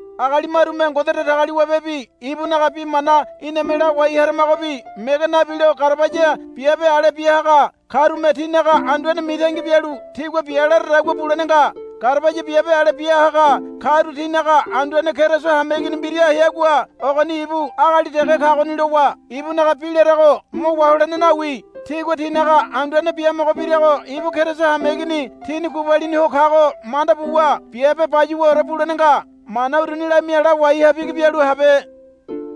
Agali marume Ngode Datagaliwabebi ibunaga bi mana iname lawai haramagobi mege nabilo garabaya biabe ale biahaga karume tinaga anduane mitangi bialu tigua bia laradagua bulene nga. Garabaya biabe ale bia haga karu tinaga anduane Keriso hameigini mbira heagua ogoni ibu agali dege kagoni lowa ibunaga bi larago mo waholene nawi. Tigua tinaga anduane biamogo birago ibu Keriso hameigini tini gubalini ho kago manda buwa biabe bayuwaore bulene nga. Mana uruni lamia lawai ha bigi bialu habe.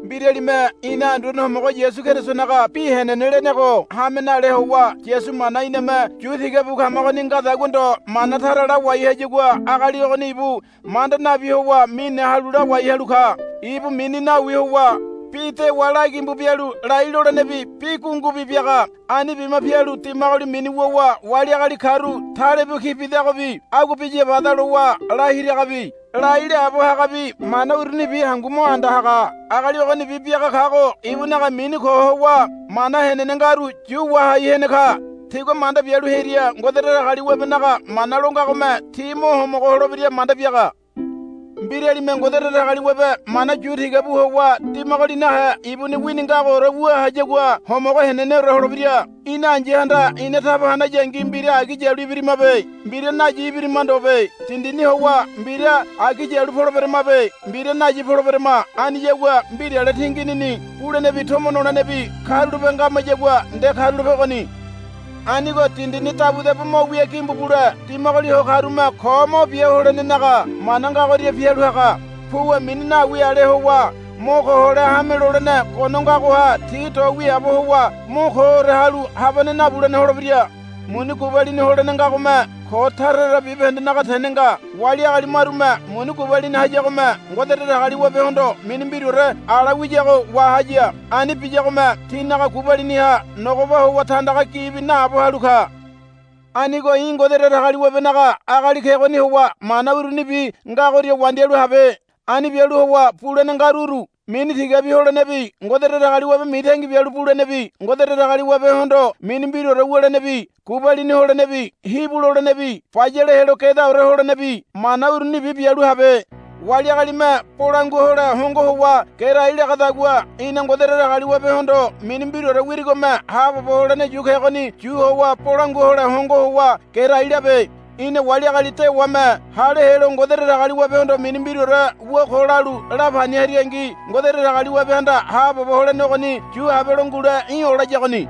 Mbiralime ina Anduane Homogo Yasu Kerisonaga bi henene lenego hame nale howa Yasu mana iname yu tiga bu kamagoni ngadagua ndo mana tara lawai hayagua agali ogoni ibu manda nabi howa mine halu lawai halu ka. Ibu mini nawi howa bi dewa la gimbu bialu lai lolenebi bi gungubi biaga. Ani bima pialu dimagoli mini wuwa wali agali karu talebu ki bidagobi agua biya bada lowa lahiragabi lai laabo hagabi mana urunibi hangu mo anda haga. Agali ogonibi biaga kago ibunaga mini ko howa mana henene ngaru yu wahai hene ka. Tigua manda bialu hearia Ngode Datagaliwabenaga mana lo ngagome ti mo homogo holebira manda biaga. Mbiralime Ngode Datagaliwabe mana yu tiga bu howa dimagoli nahe ibuni wini ngagoore wu hayagua homogo heneneore holebira. Ina ai̱yahanda ina taba hanayangi mbira agi yalu ibirimabe. Mbira nayi ibirima ndobe. Dindini howa mbira agi yalu poleberamabe. Mbira nayi poleberama. Aniyagua mbirale tinginini bulenebi tomo nolenebi karulape ngamayagua nde karulape ogoni. Anigo dindini dabudabu mo wia gimbu bule dimagoli ho karume ko mo bia holenenaga mana ngagoria pialu haga. Puwa mini nawi ale howa mo ko hole hame lolene gono ngagoha ti do wiaabo howa mo koore halu habane nabulene holebira. Muni gubalini holene ngagome ko tara tara bibahendenaga tene nga. Wali agali marume muni gubalini hayagome Ngode Datagaliwabehondo mini mbiraore ala wiyago wahaya. Ani biyagome tinaga gubaliniha nogoba howa tandaga gibi naabo halu ka. Anigo í̠ Ngode Datagaliwabenaga agali kegoni howa mana urunibi ngagoria wandialu habe. Ani bialu howa bulene ngaru uru. Mini tigabi holenebi Ngode Datagaliwabe mitangi bialu bulenebi Ngode Datagaliwabehondo mini mbiraore wulenebi gubalini holenebi hibu lolenebi bayale helo gedaore holenebi mana urunibi bialu habe. Wali agalime bolangua hole hongo howa gerai lagadagua í̠na Ngode Datagaliwabehondo mini mbiraore wirigome haabobo holene yu kegoni yu howa bolangua hole hongo howa gerai labe. Í̠na wali agali dewame hale helo Ngode Datagaliwabehondo mini mbiraore wu ko lalu lapani haringi Ngode Datagaliwabehanda haabobo holene ogoni yu habelo ngule í̠ olayagoni.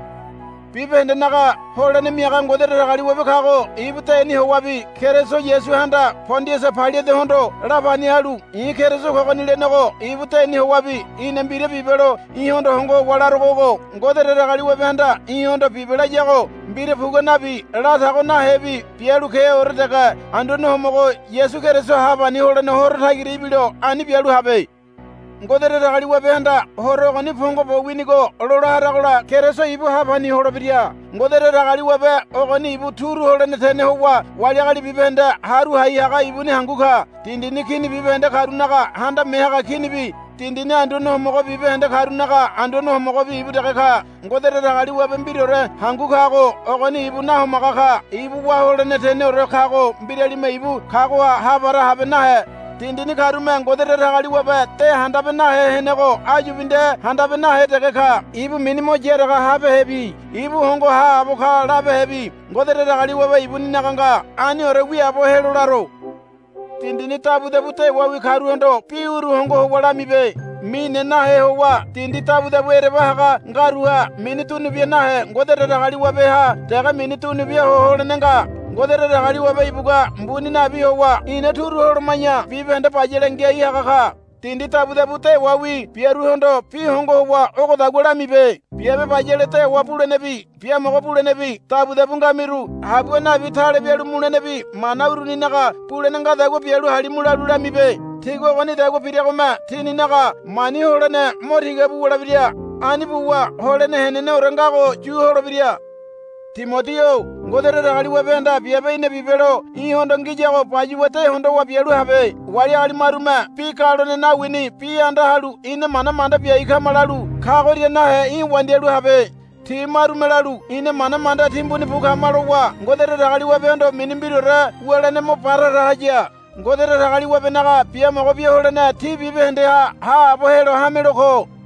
Bibahendenaga holene miaga Ngode Datagaliwabe kago ibu deni howabi Keriso Yasuhanda Pondiasa Pailatehondo lapani halu i̱ Keriso kogoni lenego ibu deni howabi í̠na mbira bibelo í̠hondo hongo howa larogo ogo. Ngode Datagaliwabehanda í̠hondo bibe layago mbira pugua nabi latago nahebi bialu keore dege Anduane Homogo Yasu Keriso hapani holene Horo tagira ibilo ani bialu habe. Ngode Datagaliwabehanda Horo ogoni pongo bo winigo lola haragola Keriso ibu hapani holebira. Ngode Datagaliwabe ogoni ibu turu holene tene howa wali agali bibahende haru hai haga ibuni hangu ka. Dindini kini bibahende karunaga Handame Haga Kinibi dindini anduane homogo bibahende karunaga Anduane Homogobi ibu dege ka. Ngode Datagaliwabe mbiraore hangu kago ogoni ibu nahomaga ka. Ibu wá holene teneore kago mbiralime ibu kagoha hapara habe nahe. Dindini karume Ngode Datagaliwabe de handabe nahe henego áyubi nde handabe nahe dege ka. Ibu mini mo yaraga habehebi ibu hongo haabo ka labehebi Ngode Datagaliwabe ibuninaga nga. Aniore wiaabo helo laro. Dindini dabudabu dewawi karuhondo bi uru hongo howa lamibe. Mine nahe howa dindi dabudabu ereba haga ngaruha mini dunubia nahe Ngode Datagaliwabeha dege mini dunubia ho holene nga. Ngode Datagaliwabe ibugua mbuni nabi howa ina turu holoma̱ya bibahende bayale ngiai haga ka. Dindi dabudabu dewawi biaruhondo bi hongo howa ogodagua lamibe, Biabe bayale dewa bulenebi biamogo bulenebi dabudabu ngamiru habua nabi tale bialu mulenebi mana uruninaga bulene ngadagua bialu halimu, lalu lamibe. Tigua ogonidagua biragome tininaga mani holene mo tiga bu wulebira. Ani buwa holene heneneore ngago yu holebira. Timodi-o Ngode Datagaliwabehanda biabe í̠na bibelo í̠hondo ngiyago bayuwa de hondowa bialu habe. Wali agali marume bi galone nawini bi anda halu, Ina mana manda biai kama, lalu kagoria nahe í̠ wandialu habe. Ti marume lalu, Ina mana manda timbuni bu kama, lowa Ngode Datagaliwabehondo mini mbiraore wulene mo ba tara haya. Ngode Datagaliwabenaga biamogo bia holene tí bibahendeha haabo helo hamelo ko.